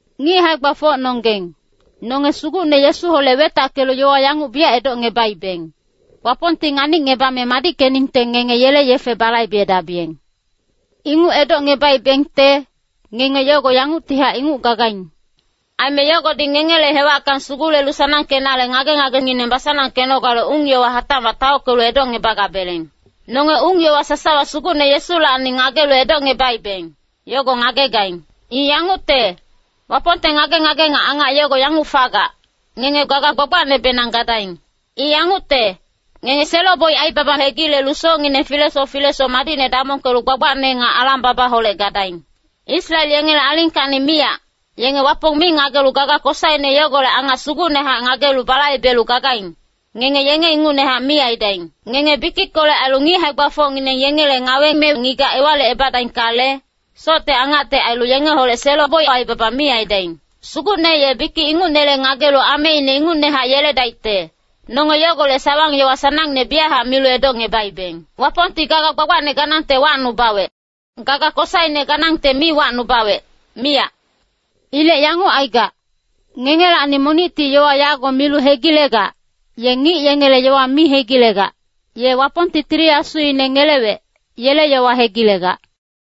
Ngic hae-gbafocnonggeng, nonge Sugucne Yesuholec wetackelu yowa yanguc biyac edocngebaibeng, Wapongti nganicngebame madickeningte ngenge yele yefe balaibedabiyeng. Inguc edocngebaibengte, ngenge yogo yanguctihac inguc gagaing. Aime yogodi ngengele hewacka sugulelu sanangkenale ngage-ngagengineng basanangkenogale ung-yowa hatacmac taockelu edocngebagabeleng. Nonge ung-yowa sasawa Sugucne Yesulacni ngagelu edocngebaibeng, yogo ngagegaing. I yangucte, Wapongte ngage-ngage nga angac yogo yanguc fagac, ngenge gaga gbagbacnebenang gadaing. I yangucte, ngenge selo-boic aibaba hegilelu socngineng filesoc filesoc madicne damongkelu gbagbacne nga alang-babaholec gadaing. Israel yengele alingkacni miyac, yenge Wapong mi ngagelu gaga kosaine yogolec angac sugucnehac ngagelu balaibelu gagaing, ngenge yenge ingucnehac mi aidaing. Ngenge bikickolec ailu ngic hae-gbafocngineng yengele ngawe me ngigac ewalicebadaingkale, socte angacte ailu yengeholec selo-boic aibaba mi aidaing. Sugucne ye bikic ingucnele ngagelu ameine ingucnehac yeledaicte, nonge yogolec sawang-yowa sanangne biyachac milu edocngebaibeng. Wapongti gaga gbagbacne ganangte wacnubawec. Gaga kosaine ganangte mi wacnubawec, miyac. Ilec yanguc aigac, ngengelacni monicti yowa yago milu hegilegac, ye ngic yengele yowa mi hegilegac, ye Wapongti Tili Asuine ngelewec, yele yowa hegilegac.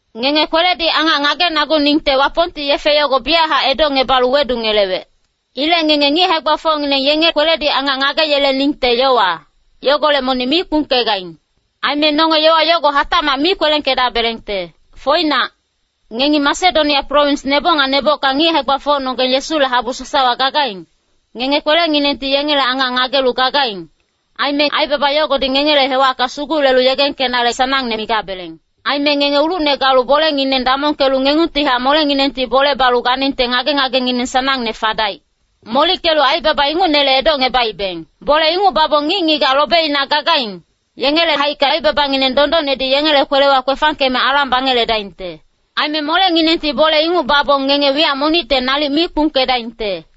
Ngenge kweledi angac ngagenaguningte Wapongti yefe yogo biyachac edocngebalu wedungelewec. Ilec ngenge ngic hae-gbafocngineng yenge kweledi angac ngageyeleningte yowa, yogolec monic mi kpungkegaing. Aime nonge yowa yogo hatacmac mi kwelengkedabelengte. Foinac, ngengi Masedonia prowins neboc nga nebocka ngic hae-gbafocnonggeng Yesule habu sasawa gagaing, ngenge kwelenginengti yengele angac ngagelu gagaing. Aime aibaba yogodi ngengele hewacka sugulelu yegengkenale sanangne migabeleng. Aime ngenge ulucne galu bolengineng damongkelu ngengungtihac molenginengti bole balu ganingte ngage-ngagengineng sanangne fadaic. Molickelu aibaba ingucnele edocngebaibeng. Bole inguc babong ngic-ngigac lobeina gagaing, yengele haicka aibabangineng dondonnedi yengele kwelewa kwefangkeme alang bangeledaingte. Aime molenginengti bole inguc babong ngenge wiyac monicte nalic mi kpungkedaingte.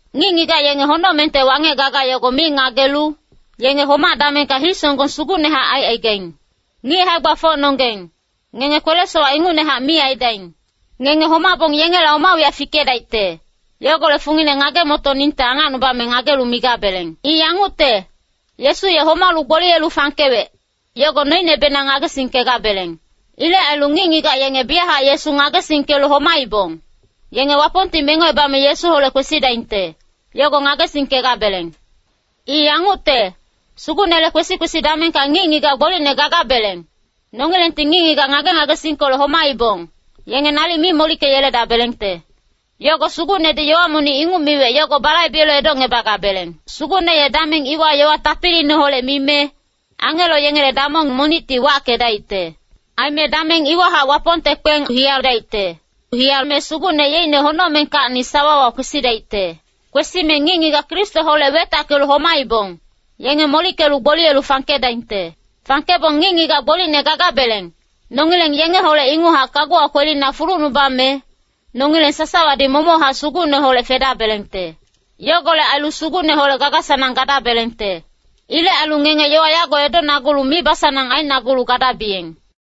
Ngic-ngigac yenge honocmengte wangec gaga yogo mi ngagelu, yenge homac-damengka hii-songgong sugucnehac aicaigaing. Ngic hae-gbafocnonggeng, ngenge kwele-sowac ingucnehac mi aidaing. Ngenge homabong yengela oma wiyac fikedaicte, yogolec fungine ngage-motoningte angacnubame ngagelu migabeleng. I yangucte, Yesu ye homalu gboliyelu fangkewec, yogo noinebenang ngagesingkegabeleng. Ilec ailu ngic-ngigac yenge biyachac Yesu ngagesingkelu homaibong, yenge Wapongti mengocebame Yesuholec kwesidaingte, yogo ngagesingkegabeleng. I yangucte, Sugucnele kwesi-kwesi damengka ngic-ngigac gbolicne gagabeleng, nongilengti ngic-ngigac ngage-ngagesingkolec homaibong, yenge nalic mi molickeyeledabelengte. Yogo Sugucnedi yowa monic inguc miwec yogo balaibelu edocngebagabeleng. Sugucne ye dameng iwa yowa tapiliineholec mime, angelo yengele damong monicti wackedaicte. Aime dameng iwahac Wapongte kpeng hiyadaicte. Hiyame Sugucne yeicne honocmengkacni sawawa kwesidaicte. Kwesime ngic-ngigac Kristoholec wetackelu homaibong, yenge molickelu gboliyelu fangkedaingte. Fangkebong ngic-ngigac gbolicne gagabeleng, nongileng yengeholec inguchac kaguwa kwelina fulucnubame, nongileng sasawadi momochac Sugucneholec fedabelengte. Yogolec ailu Sugucneholec gaga-sanang gadabelengte. Ilec ailu ngenge yowa yago edonagulu mibasanang ainagulu gadabiyeng.